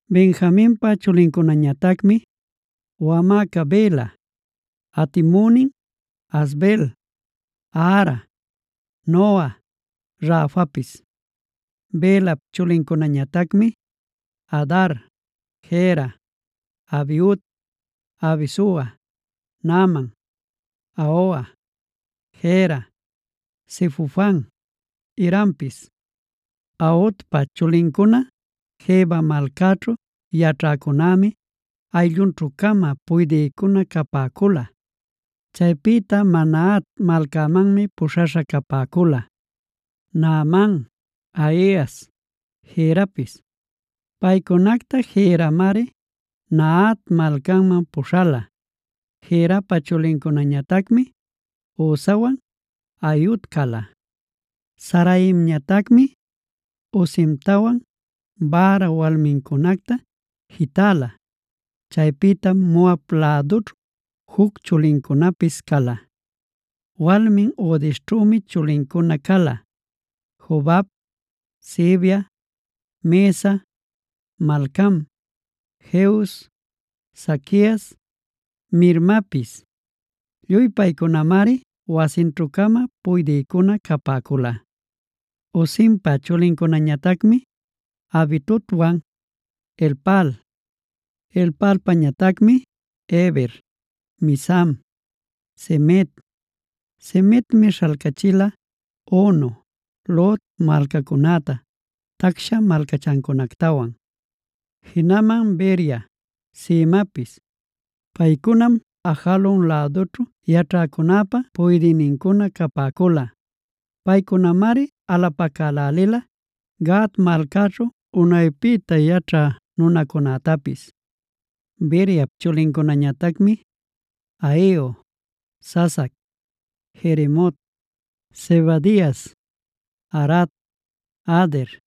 Benjaminpa chulincunañatacmi: wamäca Bela, atimünin Asbel, Ahara, Noha, Rafapis. Belap chulincunañatacmi: Adar, Gera, Abiud, Abisua, Naaman, Ahoa, Gera, Sefufan, Hirampis. Aodpa chulincuna Geba malcaćhu yaćhäcunämi ayllunćhu-cama puydïnincuna capäcula. Chaypïta Manahat malcamanmi puśhaśha capäcula: Naaman, Ahias, Gerapis. Paycunacta Geramari Manahat malcaman puśhala. Gerapa chulincunañatacmi Uzawan Ahiud cala. Saharaimñatacmi Husimtawan Baara walmincunacta jitäla. Chaypïtam Moab lädućhu juc chulincunapis cala. Walmin Hodesćhümi chulincuna cala: Jobab, Sibia, Mesa, Malcam, Jeuz, Saquias, Mirmapis. Lluy paycunamari wasinćhu-cama puydïcuna capäcula. Husimpa chulincunañatacmi Abitobwan Elpaal. Elpaalpañatacmi: Heber, Misam, Semed (Semedmi śhalcachila Ono, Lod malcacunäta tacsha malcachancunactawan), jinaman Beria, Semapis. Paycunam Ajalon lädućhu yaćhäcunäpa puydïnincuna capäcula. Paycunamari alapacälälila Gat malcaćhu unaypïta yaćhä nunacunätapis. Beriap chulincunañatacmi: Ahio, Sasac, Jeremot, Zebadias, Arad, Ader,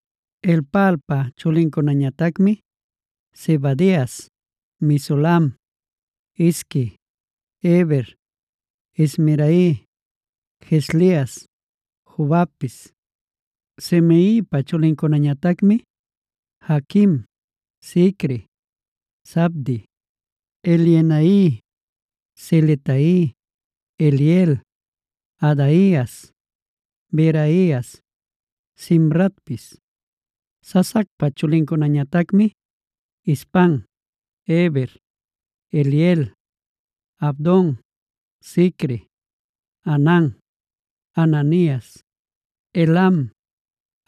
Elpaalpa chulincunañatacmi: Zebadias, Mesulam, Hizqui, Heber, Ismerai, Jezlias, Jobabpis. Simeipa chulincunañatacmi: Jaquim, Zicri, Zabdi, Elienai, Ziletai, Eliel, Adaias, Beraias, Simratpis. Sasacpa chulincunañatacmi: Ispan, Heber, Eliel, Abdon, Zicri, Hanan, Hananias, Elam,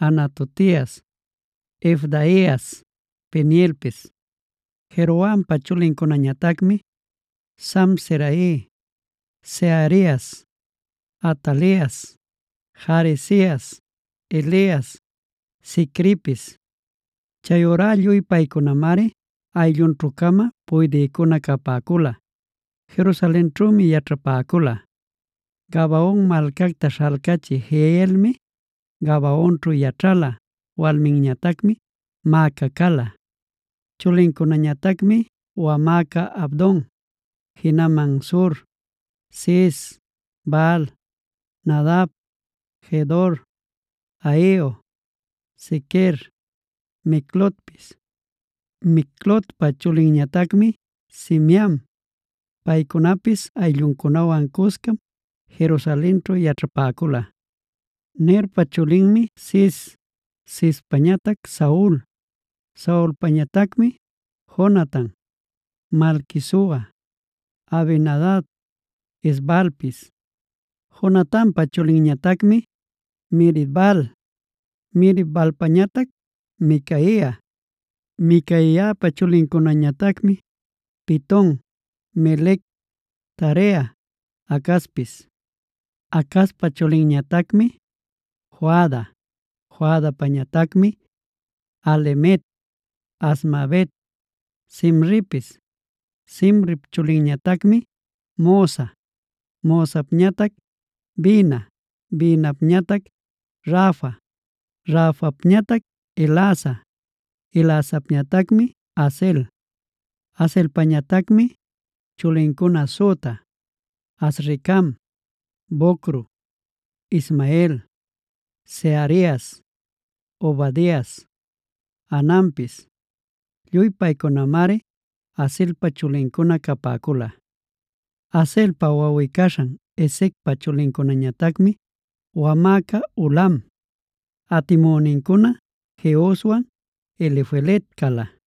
Anatotias, Ifdaias, Penielpis. Jerohampa chulincunañatacmi: Samserai, Seharias, Atalias, Jaresias, Elias, Zicripis. Chayurá lluy paycunamari ayllunćhu-cama puydïcuna capäcula; Jerusalenćhümi yaćhapäcula. Gabaon malcacta śhalcachï Jehielmia Gabaonćhu yaćhala; walminñatacmi Maaca cala. Chulincunañatacmi: wamäca Abdon, jinaman Zur, Cis, Baal, Nadab, Gedor, Ahio, Zequer, Miclotpis. Miclotpa chulinñatacmi Simeam. Paycunapis aylluncunawan cuscam Jerusalenćhu yaćhapäcula. Nerpa chulinmi Cis, Cispañatac Saul, Saulpañatacmi: Jonatan, Malquisua, Abinadab, Es-baalpis. Jonatanpa chulinñatacmi Merib-baal, Merib-baalpañatac Micaia, Micaiapa chulincunañatacmi: Piton, Melec, Tarea, Acazpis. Acazpa chulinñatacmi Joada, Joadapañatacmi: Alemet, Azmavet, Zimripis. Zimrip chulinñatacmi Mosa, Mosapñatac Bina, Binapñatac Rafa, Rafapñatac Elasa, Elasapñatacmi Azel. Azelpañatacmi chulincuna süta: Azricam, Bocru, Ismael, Searias, Obadias, Hananpis. Lluy paycunamari Azelpa chulincuna capäcula. Azelpa wawꞌi-caśhan Esecpa chulincunañatacmi: wamäca Ulam, atimünincuna Jehuswan Elifelet cala.